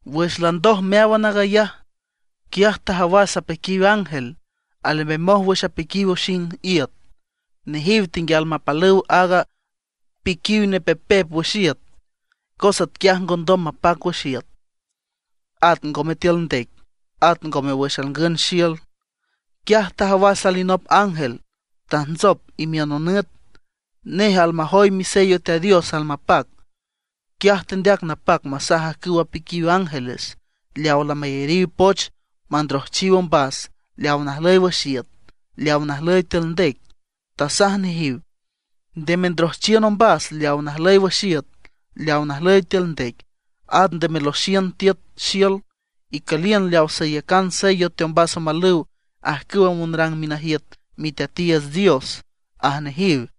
Wüx landoj meáwan aag ayaj, quiaj tajawas apiquiw ángel alembemoj wüx piquiw oxing iüt. Nejiw tenguial mapalüw aaga piquiw nepepep wüx iüt, cos atquiaj ngondom mapac wüx iüt, at ngome tiül ndec, at ngome wüx alngün xiül. Quiaj tajawas alinop ángel tajntsop imiün nonüt. Nej almajoy misello Teat Dios almapac. Quiaj tendeac napac masaj ajcüw apiquiw ángeles leaw lamayariw poch mandrojchiw ombas leaw najlüy wüx iüt, leaw najlüy tiül ndec. Tasaj nejiw: ―Nde mendrojchiün ombas leaw najlüy wüx iüt, leaw najlüy tiül ndec, at nde meloxiün tiüt xiül; icüliün leaw sayacan sello teombas omalüw ajcüw monrang minajiüt Miteatiiüts Dios ―aj nejiw.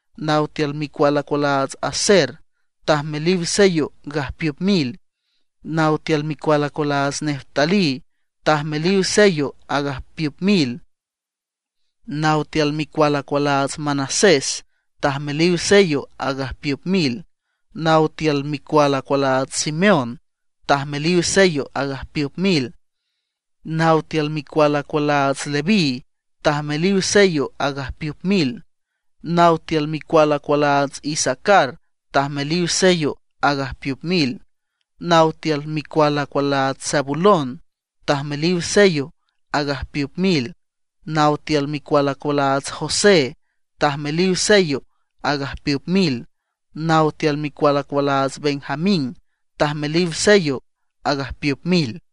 Naw tiül micual acualaats Aser tajmeliw sello agajpiüp mil. Naw tiül micual acualaats Neftalí tajmeliw sello agajpiüp mil. Naw tiül micual acualaats Manasés tajmeliw sello agajpiüp mil. Naw tiül micual acualaats Simeón tajmeliw sello agajpiüp mil. Naw tiül micual acualaats Leví tajmeliw sello agajpiüp mil. Naw tiül micual acualaats Isacar tajmeliw sello agajpiüp mil. Naw tiül micual acualaats Zabulón tajmeliw sello agajpiüp mil. Naw tiül micual acualaats José tajmeliw sello agajpiüp mil. Naw tiül micual acualaats Benjamín tajmeliw sello agajpiüp mil.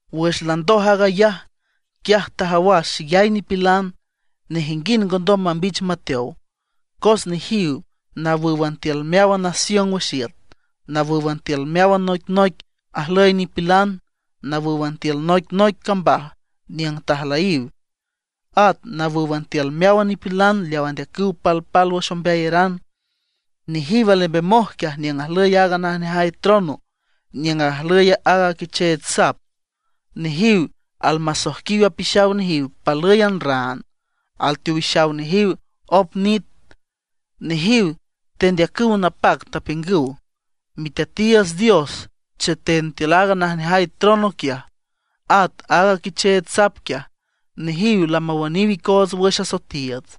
Wüx landoj aag ayaj, quiaj tajawas xeyay nipilan, nejinguind ngondom mambich mateow. Cos nejiw nawǘwan tiül meáwan nación wüx iüt; nawǘwan tiül meáwan noicnoic ajlüy nipilan; nawǘwan tiül noic noic cambaj niüng tajlüyiw. At nawǘwan tiül meáwan nipilan leaw andeacüw palpálwüx ombeayaran. Nejiw alembemoj quiaj niüng ajlüy aaga najneajay trono, niüng ajlüy aaga Quicheech Sap. Nejiw almasojquiw apixaw nejiw palǘyan raan, alteowixaw nejiw op nit. Nejiw tendeacüw napac, tapiüngüw: Miteatiiüts Dios cheten tiül aaga najneajay trono quiaj, at aaga Quicheech Sap quiaj; nejiw lamawüniw icoots wüx asoetiiüts.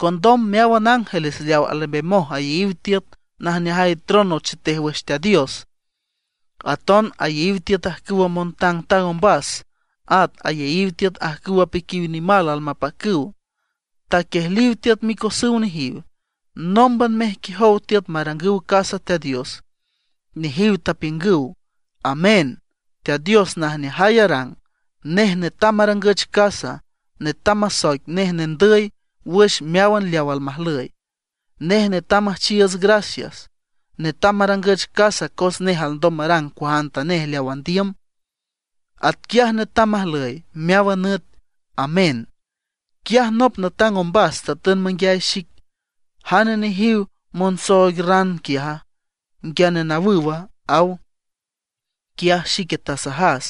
Condom meáwan ángeles leaw alembemoj ayeyiw tiüt najneajay trono chetej wüx Teat Dios, aton ayeyiw tiüt ajcüwa montangtang ombas, at ayeyiw tiüt ajcüw apiquiw nimal almapacüw, taquiejliw tiüt micosüw nejiw, nómban mejquiejow tiüt marangüw casa Teat Dios. Nejiw tapiüngüw: ¡Amén! Teat Dios najneajay arang, nej netam marangüch casa, netam masoic nej nendüy wüx meáwan leaw almajlüy. Nej netam müjchiiüts gracias; netam marangüch casa cos nej alndom marang cuajantanej leaw andiüm. Atquiaj netam majlüy meáwan nüt. Amén. Quiaj nop natang ombas tatün manguiay xic: ―¿Jane nejiwe monsooig raan quiaja, nguiane nawüwa? ―aw. Quiaj xique tasajas: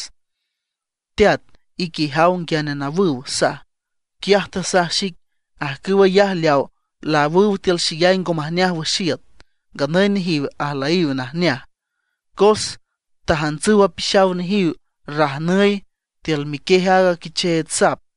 ―Teat, ique ijaw nguiane nawüw ―saj. Quiaj tasaj xic: ―Ajcüw ayaj leaw laawüw tiül xeyay ngo majneaj wüx iüt. Nganüy nejiw ajlüyiw najneaj, cos tajantsüw apixaw nejiw rajnüy tiül miquiej aaga Quicheech Sap.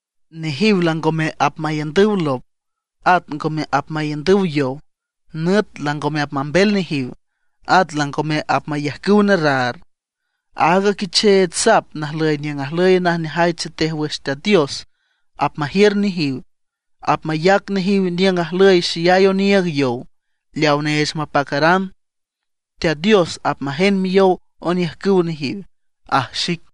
Nejiw langome apmaiündüw lop, at ngome apmaiündüw yow. Nüt langome apmambel nejiw, at langome apmayajcüw nerraar. Aaga Quicheech Sap najlüy niüng ajlüy najneajay chetej wüx Teat Dios apmajiür nejiw, apmayac nejiw niüng ajlüy xeyay oniiüg yow leawa neech mapacaran. Teat Dios apmajend miyow oniüjcüw nejiw ―aj xic.